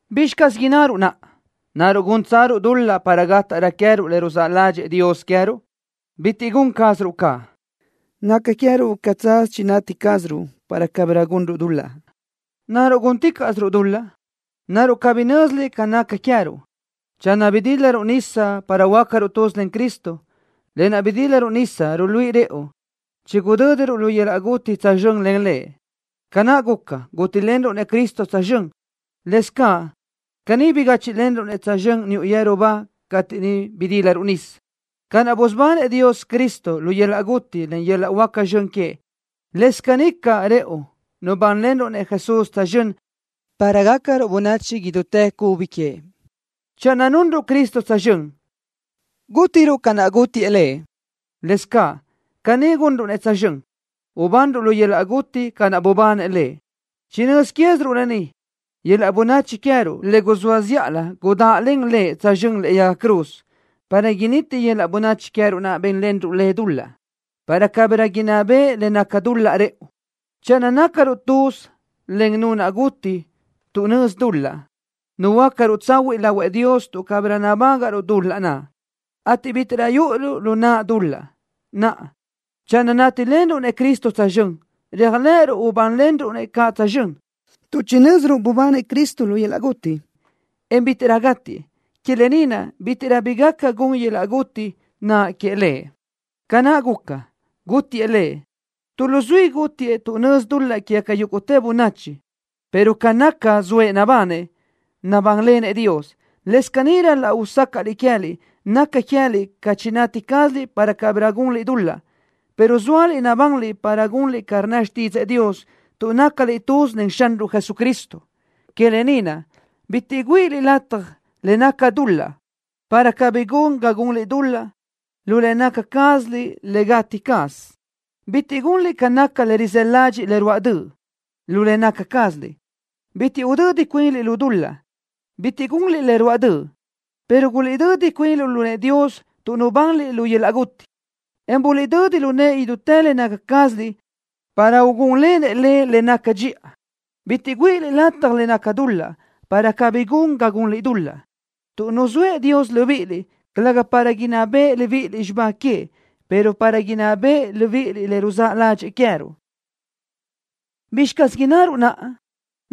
¿Bizxi caz innaruʼ naʼa? ¿Naruʼ gúntsaruʼ dul-laʼ para gátaʼrö queë́ruʼ le ruzáʼ ládxëʼë Dios queë́ruʼ? ¡Bitiʼ gun cázaruʼ caʼ! Naca queë́ruʼ ca tsaz chinati cázaruʼ para cabirö gunruʼ dul-laʼ. ¿Naruʼ gúnticaʼsiruʼ dul-laʼ? ¿Naruʼ cabí nö́ziliʼ ca naʼ naca queë́ruʼ? Channö bidílaruʼ nisa para huöácaruʼ tuz len Cristo, lë naʼ bidílaruʼ nisa ruluíʼi rëʼu chigudö́diruʼ lu yöl-laʼ guti tsözxö́n len Lëʼ. Ca naʼ guca, gútilenruʼ-nëʼ Cristo tsözxö́n, lëscaʼ caní bigáchiʼlenruʼ-nëʼ tsözxö́n niuʼ yeru ba cateʼ niʼ bidílaruʼ nisa. Ca naʼ busubanëʼ Dios Cristo lu yöl-laʼ guti len yöl-laʼ huáca zxön queëʼ, lës caní caʼ rëʼu nubánlenruʼ-nëʼ Jesús tsözxö́n para gácaruʼ bönachi idútë cubi queëʼ. Channö nunruʼ Cristo tsözxö́n, gútiruʼ ca naʼ gútiëʼ Lëʼ, lëscaʼ caní gunruʼ-nëʼ tsözxö́n, ubanruʼ lu yöl-laʼ guti ca naʼ bubanëʼ Lëʼ. Chinö́z quéziruʼ lë ni, yöl-laʼ bönachi queë́ruʼ le guzóa zíʼalö gudáʼlen Lëʼ tsözxö́n lëʼe yaga cruz, para initi yöl-laʼ bönachi queë́ruʼ naʼ bénlenruʼ le dul-laʼ, para cabirö inná beʼe le naca dul-laʼ rëʼu. Channö nácaruʼ tuz len Nu naʼ guti tuʼ nözi dul-laʼ, nuhuöácaruʼ tsahuiʼ lahuëʼ Dios tuʼ cabirö nabágaʼruʼ dul-laʼ naʼ, ateʼ bítiʼrö yúʼuruʼ lu naʼ dul-laʼ. Naʼa, channö nátilenruʼ-nëʼ Cristo tsözxö́n, réajlëʼëruʼ ubánlenruʼ-nëʼ caʼ tsözxö́n, tuʼ chinö́ziruʼ bubanëʼ Cristo lu yöl-laʼ guti, en bítiʼrö gátiëʼ. Que lë ni naʼ bítiʼrö bi gaca gun yöl-laʼ guti naʼ queëʼ Lëʼ. Ca naʼ guca, gútiëʼ Lëʼ, tu luzuísö gútiëʼ tuʼ nözi dul-laʼ quégaca yúguʼtë bönachi, pero ca naʼ naca, zoëʼ nabanëʼ, nabánlenëʼ Dios. Lëscaʼ caní ral-laʼ usácaʼliʼ queë́liʼ naca queë́liʼ ca chinati cázaliʼ para cabirö gunliʼ dul-laʼ, pero zóaliʼ nabanliʼ para gunliʼ ca rnna xtídzëʼë Dios tuʼ nácaliʼ tuz len Xanruʼ Jesucristo. Que lë ni naʼ, bitiʼ güíʼiliʼ lataj le naca dul-laʼ, para cabí gun ga gunliʼ dul-laʼ lu le naca cázaliʼ le gati caz. Bitiʼ gunliʼ ca naca le rizë́ ládxiʼliʼ le ruáʼ döʼ, lu le naca cázaliʼ. Bitiʼ udödi cuinliʼ lu dul-laʼ, bitiʼ gunliʼ le ruáʼ döʼ, pero guliʼdödi cuinliʼ lu nëʼë Dios tuʼ nubanliʼ lu yöl-laʼ guti, en guliʼdödi lu nëʼë idútë le naca cázaliʼ para ugúnlenëʼ le le naca dxiʼa. Bitiʼ güíʼiliʼ lataj le naca dul-laʼ, para cabí gun ga gunliʼ dul-laʼ, tuʼ nuzóëʼ Dios libíʼiliʼ, calëga para inná beʼe libíʼiliʼ xibá queëʼ, pero para inná beʼe libíʼiliʼ le ruzáʼ ládxëʼë queë́ruʼ. ¿Bizxi caz innaruʼ naʼa?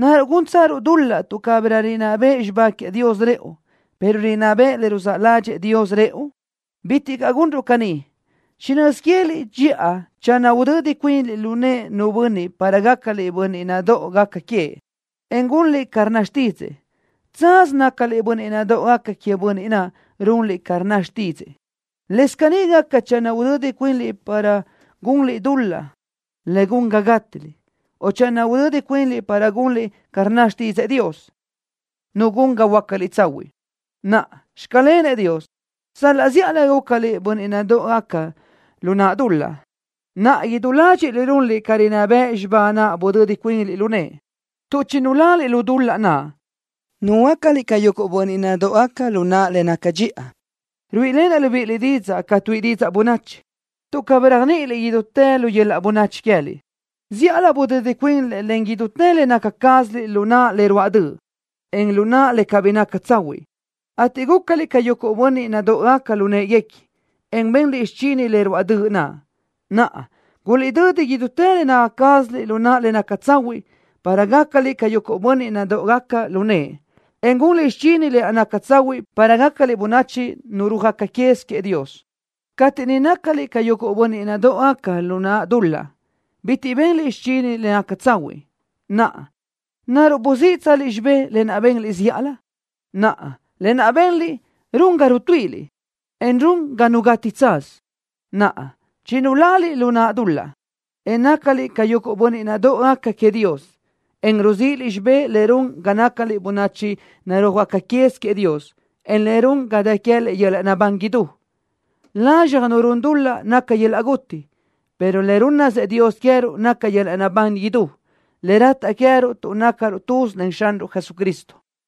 ¿Naruʼ gúntsaruʼ dul-laʼ tuʼ cabirö rinná beʼe xibá queëʼ Dios rëʼu, pero rinná beʼe le ruzáʼ ládxëʼë Dios rëʼu? ¡Bitiʼ caʼ gunruʼ caní! Chinö́z quéziliʼ dxiʼa channö udödi cuinliʼ lu nëʼë nu bönniʼ para gácaliʼ bönniʼ nadóʼogaca queëʼ, en gunliʼ ca rnna xtídzëʼë, tsaz nácaliʼ bönniʼ nadóʼogaca queëʼ bönniʼ naʼ runliʼ ca rnna xtídzëʼë. Lëscaʼ caní gaca channö udödi cuinliʼ para gunliʼ dul-laʼ le gun ga gátiliʼ, o channö udödi cuinliʼ para gunliʼ ca rnna xtídzëʼë Dios, Nu gun ga huöácaliʼ tsahuiʼ. Naʼa, ¡Xclenëʼ Dios! Sal-laʼ zíʼalö gúcaliʼ bönniʼ nadóʼogaca lu naʼ dul-laʼ, naʼa idú ládxiʼliʼ runliʼ ca rinná bëʼ xibá naʼ budödi cuinliʼ lu nëʼe. Tuʼ chinulaliʼ lu naʼ dul-laʼ, nuhuöácaliʼ ca yuguʼ bönniʼ nadóʼogaca lu naʼ le naca dxiʼa. (Ruíʼilenaʼ libíʼiliʼ didzaʼ ca tuíʼi didzaʼ bönachi, tuʼ cabí réajniʼiliʼ idútë lu yöl-laʼ bönachi queë́liʼ.) Zíʼalö budödi cuinliʼ len idútë le naca cázaliʼ lu naʼ le ruáʼ döʼ, en lu naʼ le cabí naca tsahuiʼ, ateʼ gúcaliʼ ca yuguʼ bönniʼ nadóʼogaca lu në́ʼeguequi, en benliʼ xichini le ruáʼ döʼ naʼ. Naʼa, guliʼdödi idútë le naca cázaliʼ lu naʼ le naca tsahuiʼ, para gácaliʼ ca yuguʼ bönniʼ nadóʼogaca lu nëʼe, en gunliʼ xichini lë naʼ naca tsahuiʼ para gácaliʼ bönachi narúajgaca quez queëʼ Dios. Cateʼ niʼ nácaliʼ ca yuguʼ bönniʼ nadóʼogaca lu naʼ dul-laʼ, bitiʼ benliʼ xichini le naca tsahuiʼ. Naʼa, ¿naruʼ buzíʼitsaliʼ xibé lë naʼ benliʼ zíʼalö? Naʼa lë naʼ benliʼ run ga rutuíʼiliʼ, en run ga nu gati tsaz. Naʼa chinulaliʼ lu naʼ dul-laʼ, en nácaliʼ ca yuguʼ bönniʼ nadóʼogaca queëʼ Dios, en ruzíʼiliʼ xibé le run ga nácaliʼ bönachi narúajgaca quez queëʼ Dios, en le run ga dë queë́liʼ yöl-laʼ naʼbán idú. Lazxaj nu run dul-laʼ naca yöl-laʼ guti, pero le rúnnasëʼ Dios queë́ruʼ naca yöl-laʼ naʼbán idú, le rataʼ queë́ruʼ tuʼ nácaruʼ tuz len Xanruʼ Jesucristo.